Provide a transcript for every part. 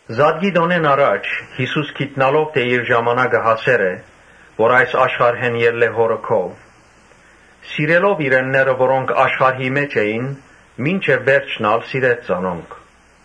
Զատկի տօնէն առաջ՝ Յիսուս գիտնալով թէ իր ժամանակը հասեր է, որ այս աշխարհէն ելլէ Հօրը քով, սիրելով իրենները, որոնք աշխարհի մէջ էին, մինչեւ վերջն ալ սիրեց զանոնք։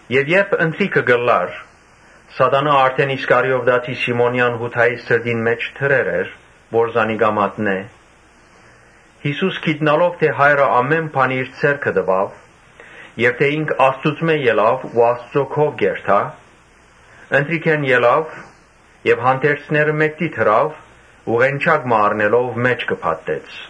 Երբ ընթրիքը կ’ըլլար, (Սատանան արդէն Իսկարիովտացի Սիմոնեան Յուդային սրտին մէջ դրեր էր, որ զանիկա մատնէ,) Յիսուս գիտնալով թէ Հայրը ամէն բան իր ձեռքը տուաւ եւ թէ ինք Աստուծմէ ելաւ ու Աստուծոյ քով պիտի երթայ, Ընթրիքէն ելաւ եւ հանդերձները մէկդի դրաւ ու ղենջակ մը առնելով մէջքը փաթթեց։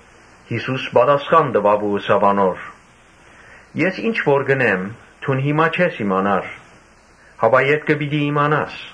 Յիսուս պատասխան տուաւ ու ըսաւ անոր. «Ես ինչ որ կ’ընեմ, դուն հիմա չես իմանար, հապա ետքը պիտի իմանաս»։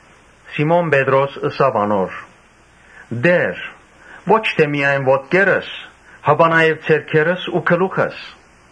Սիմոն Պետրոս ըսաւ անոր. «Տէ՛ր, ո՛չ միայն ոտքերս, հապա նաեւ ձեռքերս ու գլուխս»։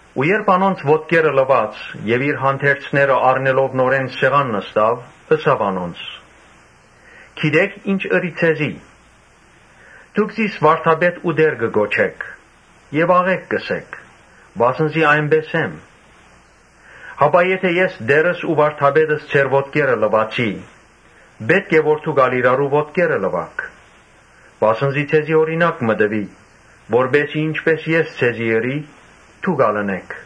Երբ անոնց ոտքերը լուաց եւ իր հանդերձները առնելով նորէն սեղան նստաւ, ըսաւ անոնց. «Գիտէ՞ք, ի՛նչ ըրի ձեզի։ Դուք զիս Վարդապետ ու Տէր կը կոչէք եւ աղէկ կ’ընէք, վասն զի այնպէս եմ։ Եթէ ես Տէրս ու Վարդապետս ձեր ոտքերը լուացի, ուրեմն պէտք է որ դուք ալ իրարու ոտքերը լուաք։ Վասն զի ձեզի օրինակ մը տուի, որպէս զի ինչպէս ես ձեզի ըրի՝ դուք ալ ընէք։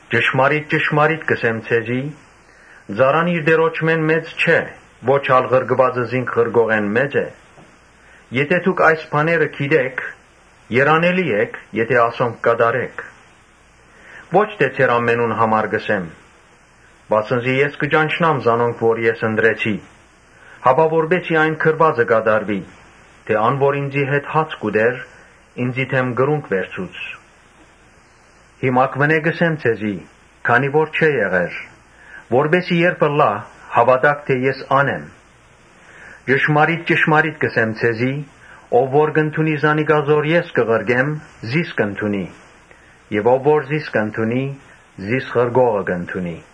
Ճշմարիտ ճշմարիտ կ’ըսեմ ձեզի. ‘Ծառան իր տիրոջմէն մեծ չէ, ոչ ալ ղրկուածը զինք ղրկողէն մեծ է’։ Եթէ դուք այս բաները գիտէք, երանելի էք եթէ ասոնք կատարէք։ Ո՛չ թէ ձեր ամենուն համար կ’ըսեմ, վասն զի ես կը ճանչնամ զանոնք որ ես ընտրեցի, հապա որպէս զի այն գրուածը կատարուի թէ՝ ‘Ան որ ինծի հետ հաց կ’ուտէր, ինծի դէմ կրունկ վերցուց’։ Հիմակուընէ կ’ըսեմ ձեզի երբ դեռ չէ եղեր, որպէս զի երբ ըլլայ, հաւատաք թէ ես ան եմ։ Ճշմարիտ ճշմարիտ կ’ըսեմ ձեզի. ‘Ով որ կ’ընդունի զանիկա զոր ես կը ղրկեմ, զիս կ’ընդունի եւ ո՛վ որ զիս կ’ընդունի, զիս ղրկողը կ’ընդունի’»։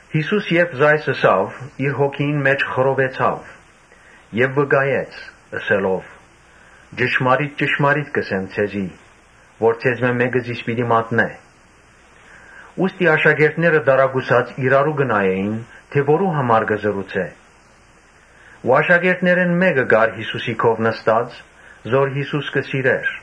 Յիսուս երբ ասիկա ըսաւ, իր հոգիին մէջ խռովեցաւ եւ վկայեց՝ ըսելով. «Ճշմարիտ ճշմարիտ կ’ըսեմ ձեզի, որ ձեզմէ մէկը զիս պիտի մատնէ»։ Ուստի աշակերտները տարակուսած իրարու կը նայէին թէ որո՞ւ համար կ’ըսէ։ Աշակերտներէն մէկը կար Յիսուսին Յուն., գոգըքով նստած, զոր Յիսուս կը սիրէր։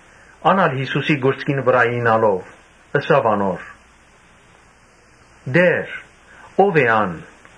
Ան ալ Յիսուսին կուրծքին վրայ իյնալով՝ ըսաւ անոր. «Տէ՛ր, ո՞վ է ան»։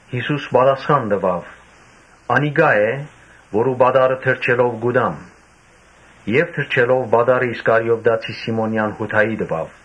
Յիսուս պատասխան տուաւ. «Անիկա է՝ որուն այս պատառը թրջելով կու տամ»։ Եւ թրջելով պատառը՝ Իսկարիովտացի Սիմոնեան Յուդային տուաւ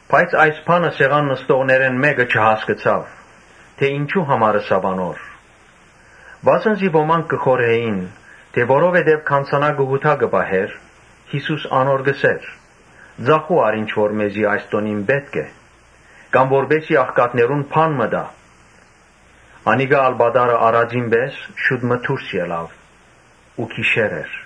Բայց այս բանը սեղան նստողներէն մէ՛կը չհասկցաւ, թէ ինչո՞ւ համար ըսաւ անոր։ Վասն զի ոմանք կը խորհէին թէ՝ որովհետեւ գանձանակը Յուդան կը պահէր, Յիսուս անոր կ’ըսէր. «Ծախո՛ւ առ ինչ որ մեզի այս տօնին պէտք է, կամ՝ որպէս զի աղքատներուն բան մը տայ»։ Անիկա ալ պատառը առածին պէս շուտ մը դուրս ելաւ ու գիշեր էր։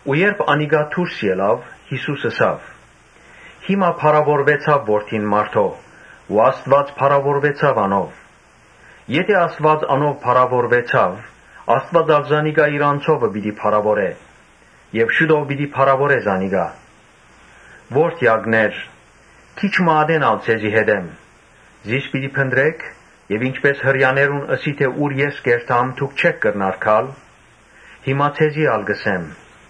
Երբ անիկա դուրս ելաւ, Յիսուս ըսաւ. «Հիմա փառաւորուեցաւ Որդին մարդոյ ու Աստուած փառաւորուեցաւ անով. Եթէ Աստուած անով փառաւորուեցաւ, Աստուած ալ զանիկա իր անձովը պիտի փառաւորէ եւ շուտով պիտի փառաւորէ զանիկա։ Ո՛րդեակներ, քիչ մը ատեն ալ ձեզի հետ եմ, զիս պիտի փնտռէք եւ ինչպէս Հրեաներուն ըսի թէ՝ ‘Ես ուր որ կ’երթամ, դուք չէք կրնար գալ’, հիմա ձեզի ալ կ’ըսեմ.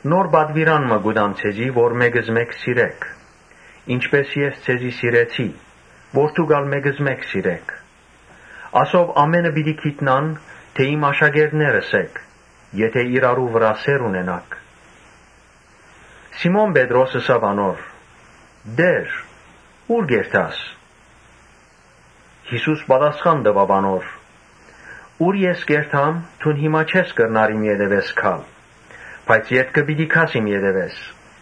‘Նոր պատուիրան մը կու տամ ձեզի, որ մէկզմէկ սիրէք, ինչպէս ես ձեզ սիրեցի, որ դուք ալ մէկզմէկ սիրէք’։ Ասով ամէնքը պիտի գիտնան թէ իմ աշակերտներս էք, եթէ իրարու վրայ սէր ունենաք»։ Սիմոն Պետրոս ըսաւ անոր. «Տէ՛ր, ո՞ւր կ’երթաս»։ Յիսուս պատասխան տուաւ անոր. «Ուր ես կ’երթամ, դուն հիմա չես կրնար իմ ետեւէս գալ, բայց ետքը պիտի գաս իմ ետեւէս»։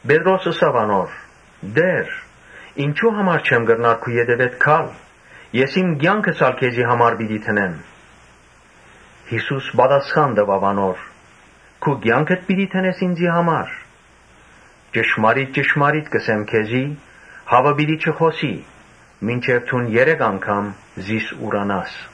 Պետրոս ըսաւ անոր. «Տէ՛ր, ինչո՞ւ հիմա չեմ կրնար քու ետեւէդ գալ. ես իմ կեանքս ալ քեզի համար պիտի դնեմ»։ Յիսուս պատասխան տուաւ անոր. «Քու կեա՞նքդ պիտի դնես ինծի համար. ճշմարիտ ճշմարիտ կ’ըսեմ քեզի, Հաւը պիտի չխօսի՝ մինչեւ դուն երեք անգամ զիս ուրանաս»։